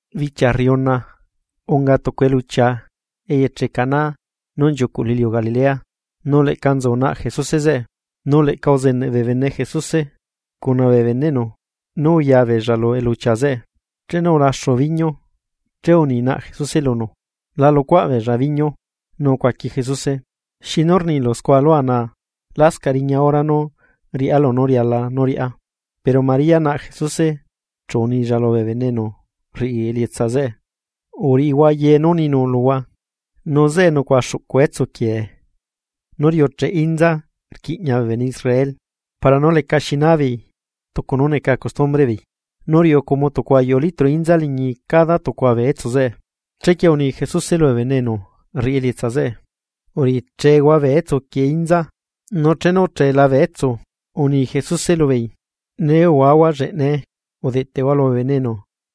Bichia rriuna, unga tucu eluchia eyeche Caná nú nchiucuꞌ lu iliu Galilea. Nu leꞌca nzu naꞌ Jesuse zeꞌe, nu leꞌca uzeneꞌ bee bene Jesuse cuna bee beneꞌnu nu uya beella lu eluchia zeꞌe. Chenu ulaxu biñu, che uni naꞌ Jesuse lunu: ―La lucuaꞌ beella biñu. Nu ucuaqui Jesuse: ―¿Xinu rnilu nucuaꞌ lua naa? Lascaꞌ riña hora nú riꞌá lunú riala nú riꞌá. Pero María naꞌ Jesuse chu unilla lubee bene enu rriꞌi elietsa zeꞌe: ―Uriꞌihua ye nú ninu luhua. Nu zeꞌe nucuaꞌa xuꞌcu etsu quiee, nú riucheꞌ inza rquiꞌña bee bene Israel para nú lecaxi naa beei tucu nú neca costumbreꞌ beei, nu riuꞌu como tucu ayuꞌu litro inza liñi cada tucua bee etsu zeꞌe. Chequie uni Jesuse lubee bene enu rriꞌi elietsa zeꞌe: ―Uriꞌichehua bee etsuquieꞌ inza. Nu chenu uchela bee etsu, uni Jesuse lubeei: ―Nee uhuahua lleꞌnae, udeꞌteꞌhua lubee bene enu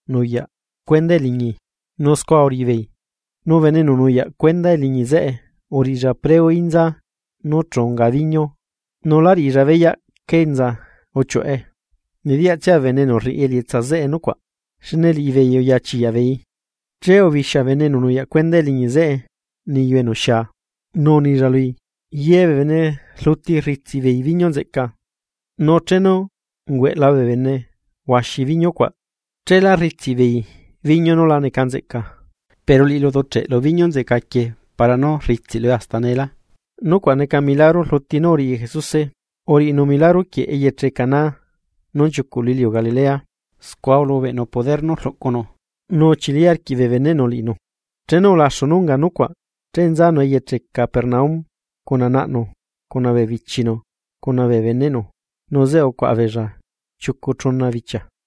nuyaꞌ cuendaꞌ eliñi. Nu scua uriꞌi beei. Nu bene enu nuyaꞌ cuenda eliñi zeꞌe uriꞌilla preo inza nú unga biñu, nu lá riꞌilla beyaꞌ cá enza uchiuꞌe, nediyaꞌtsia bee bene enu rriꞌi elietsa zeꞌe nucuaꞌ, xne liꞌibeei uya chiyaꞌbeeii, che ubixia bene enu nuyaꞌ cuenda eliñi zeꞌe niyu enu xia, nu unilla lui: ―Ye bee bene rluti rritsiꞌbeei biñu nzeꞌca, nu chenu ungueꞌla bee bene huaxi biñu cuaꞌ, cheelá rritsiꞌbeei biñu nú la neca nzeꞌca. Pero liꞌilu uduꞌcheꞌelu biñu nzeꞌca quieꞌ para nú rritsiꞌlue hasta neelá. Nucuaꞌ neca milagro rluti nú uriꞌi Jesuse, uriꞌinu milagro quieꞌ eyeche Caná nú nchiucuꞌ lu iliu Galilea, scua ulubeꞌnu poder nú rluꞌcunu nu uchili arquiꞌ bee beneꞌnu liꞌinu. Chenu ulaxu nú unga nucuaꞌ che nzanu eyeche Capernaum, cuna naꞌnu, cuna bee bichinu cuna bee beneꞌnu, nu zeꞌe ucuaꞌa beella chiucu chuna bichia.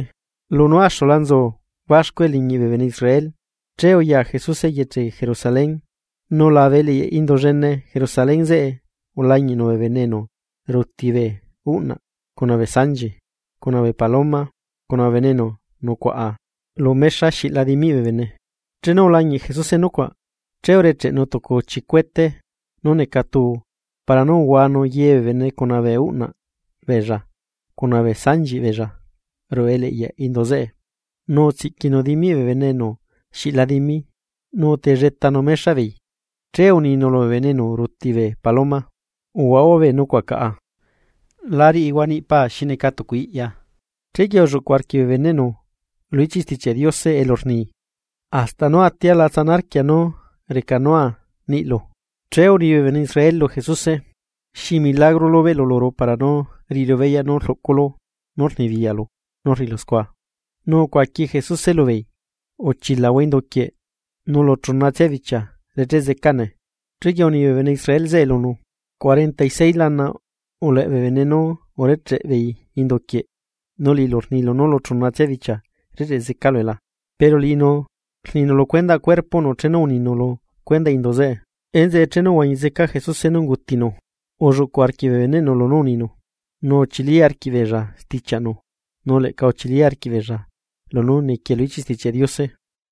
Lunú axula nzu baxcu eliñiꞌ bee bene Israel, che uya Jesuse eyeche Jerusalén. Nu labe eleꞌyaꞌ indu llene Jerusalén zeꞌe ulañiꞌnu bee bene enu ruti bee uꞌnaꞌ, cuna bee sanchi, cuna bee paloma, cuna bee bene enu nucuaꞌa lu mexa xiꞌla dimiꞌ bee bene. Chenu ulañiꞌ Jesuse nucuaꞌ, che urecheꞌnu tucu chicuete nú neca tuu para nú uhuanu ye bee bene cuna bee uꞌnaꞌ beella, cuna bee sanchiꞌ beella ruꞌu eleꞌyaꞌ indu zeꞌe, nu utsiꞌquinu dimiꞌ bee bene enu xiꞌla dimi, nu utelletanu mexaꞌ beei. Che uninu lubee bene enu ruti bee paloma: ―¡Uhuahua bee nucuaꞌ caꞌa! ¡La riꞌihua niꞌi paa xi neca tucu iꞌya! Chequie ulluꞌcu arquiꞌ bee beneꞌnu lu ichiꞌ Stichiaꞌ Diose elu rni: “Hasta nú atia la tsana arquia nú recanua niꞌlu.” Che uni bee bene Israel lu Jesuse: ―¿Xi milagro lubeꞌlu luru para nú riꞌiru beyaꞌ nú rluꞌculu nu rnibiyaꞌlu nú rriꞌilu scua? Nu ucuaqui Jesuse lubeei: ―Uchilahua induquieꞌ, nu lu chunatsia bichia recheꞌ zecane. Chequie uni bee bene Israel zeꞌe lunu: ―Cuarenta y seis lana uleꞌ bee bene nú urecheꞌe beei indu quieꞌ, ¿nu liꞌilu rnilu nú lu chunatsia bichia recheꞌ zecalue la? Pero liꞌinu rninu lu cuendaꞌ cuerpoꞌnu chenu uninu lu cuendaꞌ indu zeꞌe. Enzeꞌe chenu uhuañi zeca Jesuse nú ungutinu, ulluꞌcuꞌ arquiꞌ bee beneꞌnu lunú uninu, nu uchili arquiꞌbeella stichiaꞌnu nu leꞌca uchili arquiꞌ beella lunú niquie lu ichiꞌ Stichiaꞌ Diose.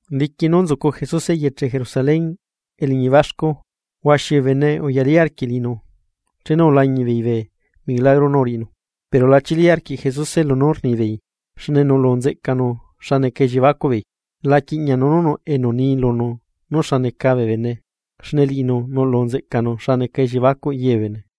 Diqui nú nzucu Jesuse eyeche Jerusalén eliñi baxcu, huaxi bee bene uyalí arquiꞌ liꞌinu chenu ulañiꞌ beei bee milagro nú uriꞌinu. Pero la chili arquiꞌ Jesuse lunú rnibeei, xne nuꞌlu nzeꞌcanu xa neca elliebacuꞌbeei. La quiꞌñanu nú nuꞌ enu ni lunu nú xa neca bee bene, xne liꞌinu nuꞌlu nzeꞌcanu xa neca elliebacuꞌ ye bee bene.